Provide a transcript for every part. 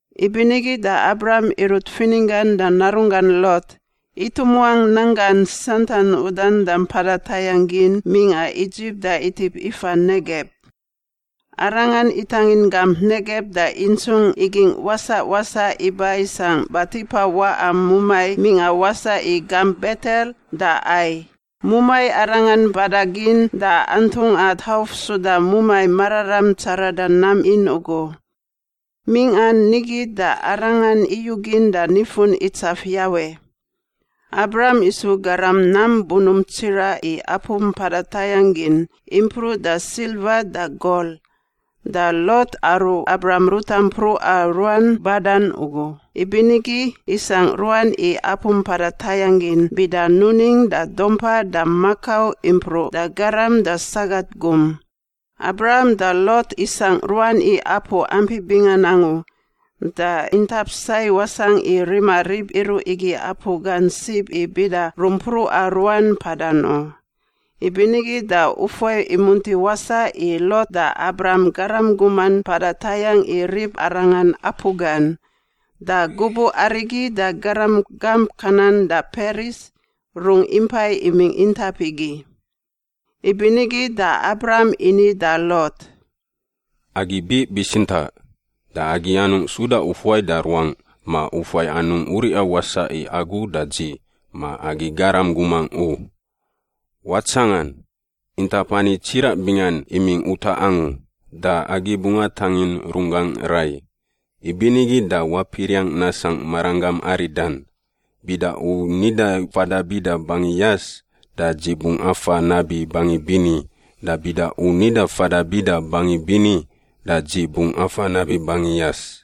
Ibinigi da Abram irut fininggan da narunggan Lot itumuangꞌ nanggan santan udan da mpada tayangꞌ gin mingꞌa Idzip da itip ifa Negeb. Arangan itangin gamp Negeb da intsungꞌ igingꞌ wasaꞌ wasaꞌ iba isangꞌ batipa waꞌa mumai mingꞌa wasaꞌ i gamp Betel da Ai, mumai arangan mpada gin da antungꞌa tauf suda mumai mararam tsarada nam in ugu. Mingꞌan nigi da arangan iyugin da nifun itsaf Yawe. Abram isu garam nam bunump tsiraꞌ i apu mpada tayangꞌ gin, impruꞌ da silva da gol. Da Lot, aru Abram ruta mpruꞌa ruan badan ugu, ibinigi isangꞌ ruan i apu mpada tayangꞌ gin bida nuning da dumpa da makau impruꞌ da garam da sagat gum. Abram da Lot isangꞌ ruan i apu ampi bingan angu da intap sai wasangꞌ i rima rib iruꞌ igi apu gan sib i bida rumpruꞌa ruan mpadan u. Ibinigi da ufuai imunti wasaꞌ i Lot da Abram garam guman mpada tayangꞌ i ribarangan apu gan. Da gubuꞌ arigi da garam gamp Kanan da Peris rungꞌ impai imingꞌ intap igi. Ibinigi da Abram ini da Lot, “Agi biꞌ bitsintaꞌ! Da agi anungꞌ suda ufuai da ruangꞌ ma ufuai anungꞌ uriꞌa wasaꞌ i agu da dzi ma agi garam gumangꞌ u. Watsangan! Intap ani tsiraꞌ bingan imingꞌ utaꞌ angu, da agi bungꞌ atangin runggangꞌ rai. Ibinigi da wapiriangꞌ nasangꞌ maranggam aridan. Bida u nida fada bida bangi yas, da dzi bungꞌ afa nabi bangi bini, da bida u nida fada bida bangi bini, da dzi bungꞌ afa nabi bangi yas.”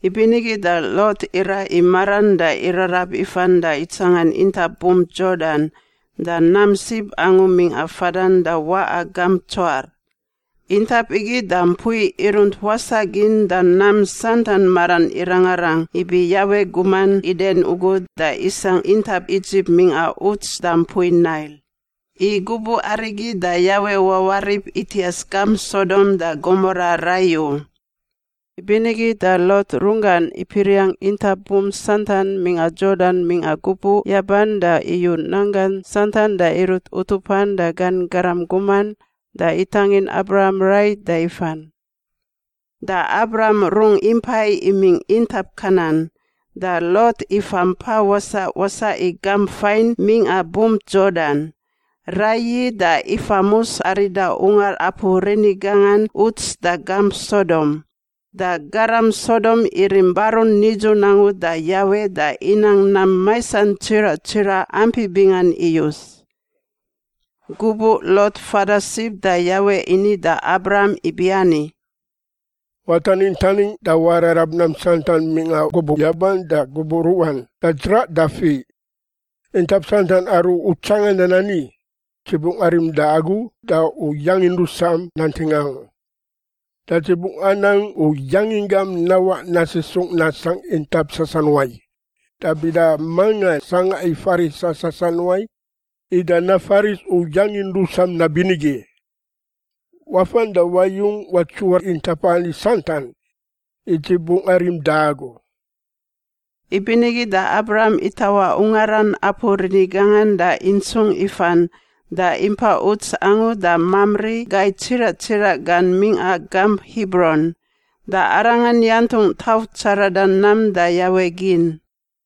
Ibinigi da Lot iraꞌ i maran da irarab ifan da itsangan intap bump Yordan da nam sib angu mingꞌa fadan da waꞌa gamp Tsoar. Intap igi da mpui irunt wasaꞌ gin da nam santan maran irangarang ibi Yawe guman Iden ugu da isangꞌ intap Idzip mingꞌa uts da mpui Nail. (I gubuꞌ arigi da Yawe wawarip itias gamp Sodom da Gomora rai u.) Ibinigi da Lot runggan ipiriangꞌ intap bump santan mingꞌa Yordan mingꞌa gubuꞌ yaban da iyu nanggan santan da irut utupan da gan garam guman da itangin Abram rai da ifan. Da Abram rungꞌ impai imingꞌ intap Kanan, da Lot ifa mpa wasaꞌ wasaꞌ i gamp fain mingꞌa bump Yordan, raiyi da ifamus arida ungar apu rini gangan uts da gamp Sodom. Da garam Sodom irim barun nidzun angu da Yawe da inang nam maisan tsiraꞌ tsiraꞌ ampi bingan iyus. Gubuꞌ Lot fada sib da Yawe ini da Abram ibiani, “Wataningꞌ taningꞌ da wararab nam santan mingꞌa gubuꞌ yaban da gubuꞌ ruꞌan da dzraꞌ da fiꞌ. Intap santan aru u tsangandan ani, dzi bungꞌ arim da agu da u yangin rusam nanting angu. Da dzi bungꞌ anang u yanginggam nawaꞌ nasisungꞌ nasangꞌ intap sasanuai, da bida manga sangꞌa i farisa sasanuai ida nafaris u yangin rusam nabinigi. Wafan da wayung watsuwar intap ani santan, i dzi bungꞌ arim da agu.” Ibinigi da Abram itawaꞌ ungaran apu rini gangan da intsungꞌ ifan da impa uts angu da Mamri gai tsiraꞌ tsiraꞌ gan mingꞌa gamp Hibron. Da arangan yantungꞌ tauf tsarada nam da Yawe gin.